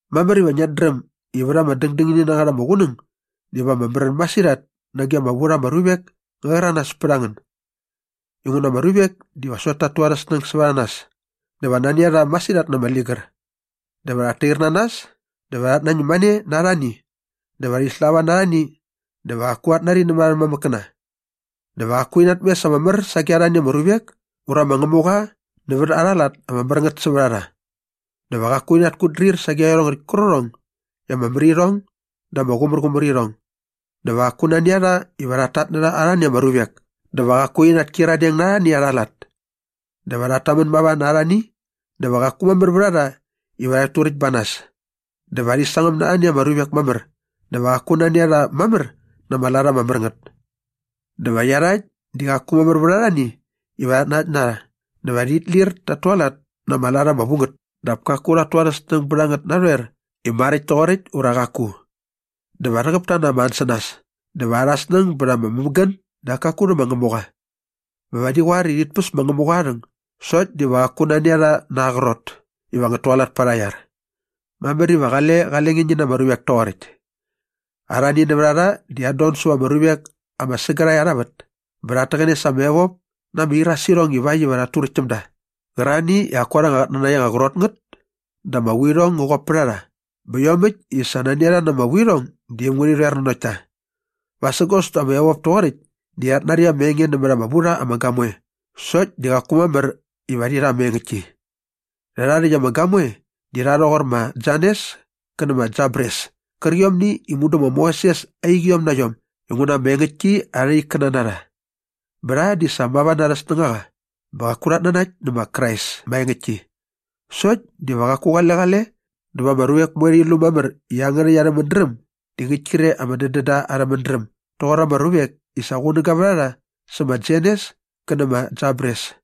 Mamär iva ngiat dräm i vät ama dängdängini na ngät ama qunäng diva ama märän masirhat nage ama vu rha ama ruvek ngä rhäranas pät a ngän inguna ama ruvek diva sokt ta tu arhä snäng sävät a nas dä va nani a rha masirhat na ama ligär. Dä va rhat tair na nas dä va rhat nañäm mane na arhani dä va rhi slava na arhani dä va qaku rhat nari nämät arhä mamäkkäna. Dä va qaku rhi natmes ama mär sage arhani ama ruvek ura ma Ngämuqa nävät arha lat ama mär ngät sävät a rha. Dä va qaku rhit kutdrir sage iarhongäkt kärqärhong i ama mär irhong dä ama qumärqumär irhong. Dä va qaku nani a rha iva rhat tatnärha arhani ama ruvek dä va qaku rhi natkyiradeng na arhani arha lat. Dä va rhat tamän mava na arhani dä va qaku mamär vät a rha iva rhat turäkt ba nas. Dä va rhi sangäm na arhani ama ruvek mamär dä va qaku nani a rha mamär na ama lat ama mär ngät. Dä va iarhakt di qaku mamär vät arhani iva rhat nanakt na rha dä va rhit lir tat tualat na ama lat ama vu ngät dap kaku rha tu arhä snäng bät a ngät narhoer i maräkt toqoräkt ura qaku. Dä va rhäqäp ta na ama ansänas dä va arhä snäng bät ama mämägän dap kaku rhä ma Ngämuqa. Bä va rhi qoar i rhit päs ma Ngämuqa aa rhäng sokt diva qaku nani a rha na aa qrot iva ngät tualat pät arha iar. Mamär iva qale qale nge ngi na ama ruvek toqoräkt. Arhani nävät a rha di rhat don säva ama ruvek ama sägärhae arha vät bä rhat täqäne sa ama evop na ama irasirhong ivakt iva rhat turäkt täm da qärarhani i qaku arhä qatnanakt ama qrot ngät dä ama vuirhong ngä qop pät a rha bä iomäkt i sa nani a rha na ama vuirhong di äm ngärhi rhoer nanokt ta. Vasägos dä ama evop toqoräkt di rhat nari ama enge nämät ama vu rha ama gamoe sokt di qaku mamär iva rhi rha ama engäktki. Rhärha rhäkt ama gamoe di rha rhoqor ma Janes kä nä ma Jambres kärqiomni i mudu ma Moses aa iqiom na iom inguna ama engäktki arha ikkäna na rha. Bä rha di sa mava na arhä snängaqa bä qaku rhat nanakt nä ma Krais maengäktki sokt diva qaku qale qale dä va ama ruvek moe rhi lu mamär i iangärhäkt arhä mädräm di ngäkt kre ama dädända arhä mädräm doqor ama ruvek i sa qunäga vät a rha sä ma Janes kä nä ma Jambres.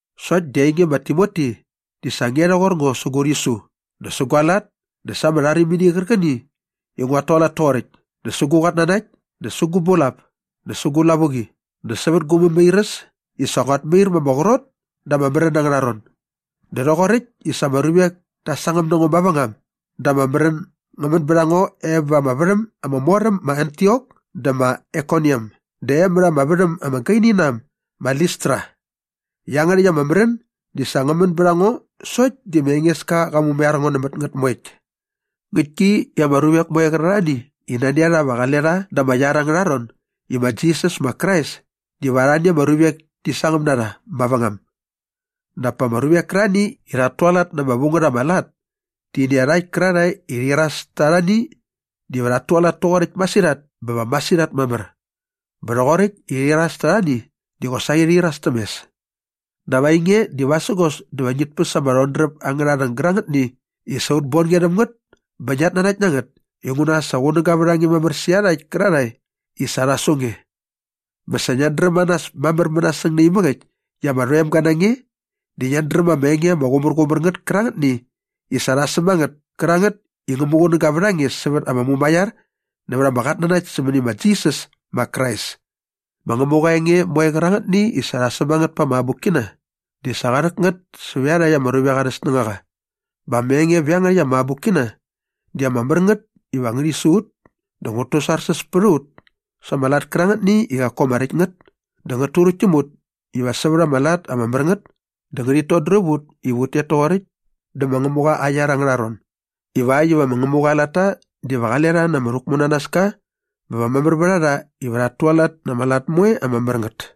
Sokt di ainge ma Timoti, di sa nge rhoqor ngo sä gu rhisu dä sä gua lat dä sa ama rharimini qärqäni i nguat tualat toqoräkt dä sä gu qatnanakt dä sä gu bulap dä sä gu lavuqi dä sävät gu mämairäs i sa nguat mair ma ama qrot da ama märän angärha ron dä rhoqoräkt i sa ama ruvek ta sangäm na ngo mavängam dä ama märän ngä män bät a ngo e va ama värham ama mor am ma Antiok dä ma Aikoniam dä e mät ama värhäm ama gaini na äm ma Listra. Iangärhäkt ama märän di sa ngä män bät a ngo sokt di ma Engeska qa mumaiar ngo nämät ngät moekt. Ngäktki i ama ruvek moe qärarhani i nani a rha iva qale rha da ama iar angärha ron i ma Jisas ma Krais diva arhani ama ruvek ti sangäm na rha mavängam dap pa ama ruvek kärarhani i rhat tualat na ama vu ngät ama lat ti nä iarhakt kärarhae i rhi iras ta arhani diva rhat tualat toqoräkt masirhat bä va masirhat mamär. Bä rhoqoräkt i rhi iras ta arhani di qosaqi rhi iras täm mes. Dap ainge di vasägos dä va ngit päs ama rhodräp angärha rhäng gärangätni i sa ut bon nge rhäm ngät bä ngiat nanakt na ngät inguna sa qunäga vät a nge mamär sä iarhakt kärarhae i sa rha su nge. Bä sa ngiat dräm a nas mamär mänasäng naimäk äkt i ama rhoemga na nge dä ngiat dräm ama enge ama qumärqumär ngät kärangätni i sa rha säm a ngät kärangät i ngä muqunäga vät a nge sävät ama mumaiar nävät ama qatnanakt sämäni ma Jisas ma Krais. Ma Ngämuqa aa enge moe qärangätni i sa rha säm a ngät pa ama abukkina di sa qa rhäk ngät sävä iarhakt ama ruvek arhä snängaqa bä ama enge vä iangärhäkt ama abukkina di ama mär ngät iva ngärhi su ut dä ngät tusarsäs pät a ut sa ama lat kärangätni i qaku ama räkt ngät dä ngät turäkt täm ut iva sävät ama lat ama mär ngät dä ngärhit todräp ut iva ut tet toqoräkt dä ma Ngämuqa aa iar angärha ron ivakt iva ma Ngämuqa aa latta diva qale rha na ama rhäkmunanaska bä va mamär vät a rha iva rhat tualat na ama lat moe ama mär ngät.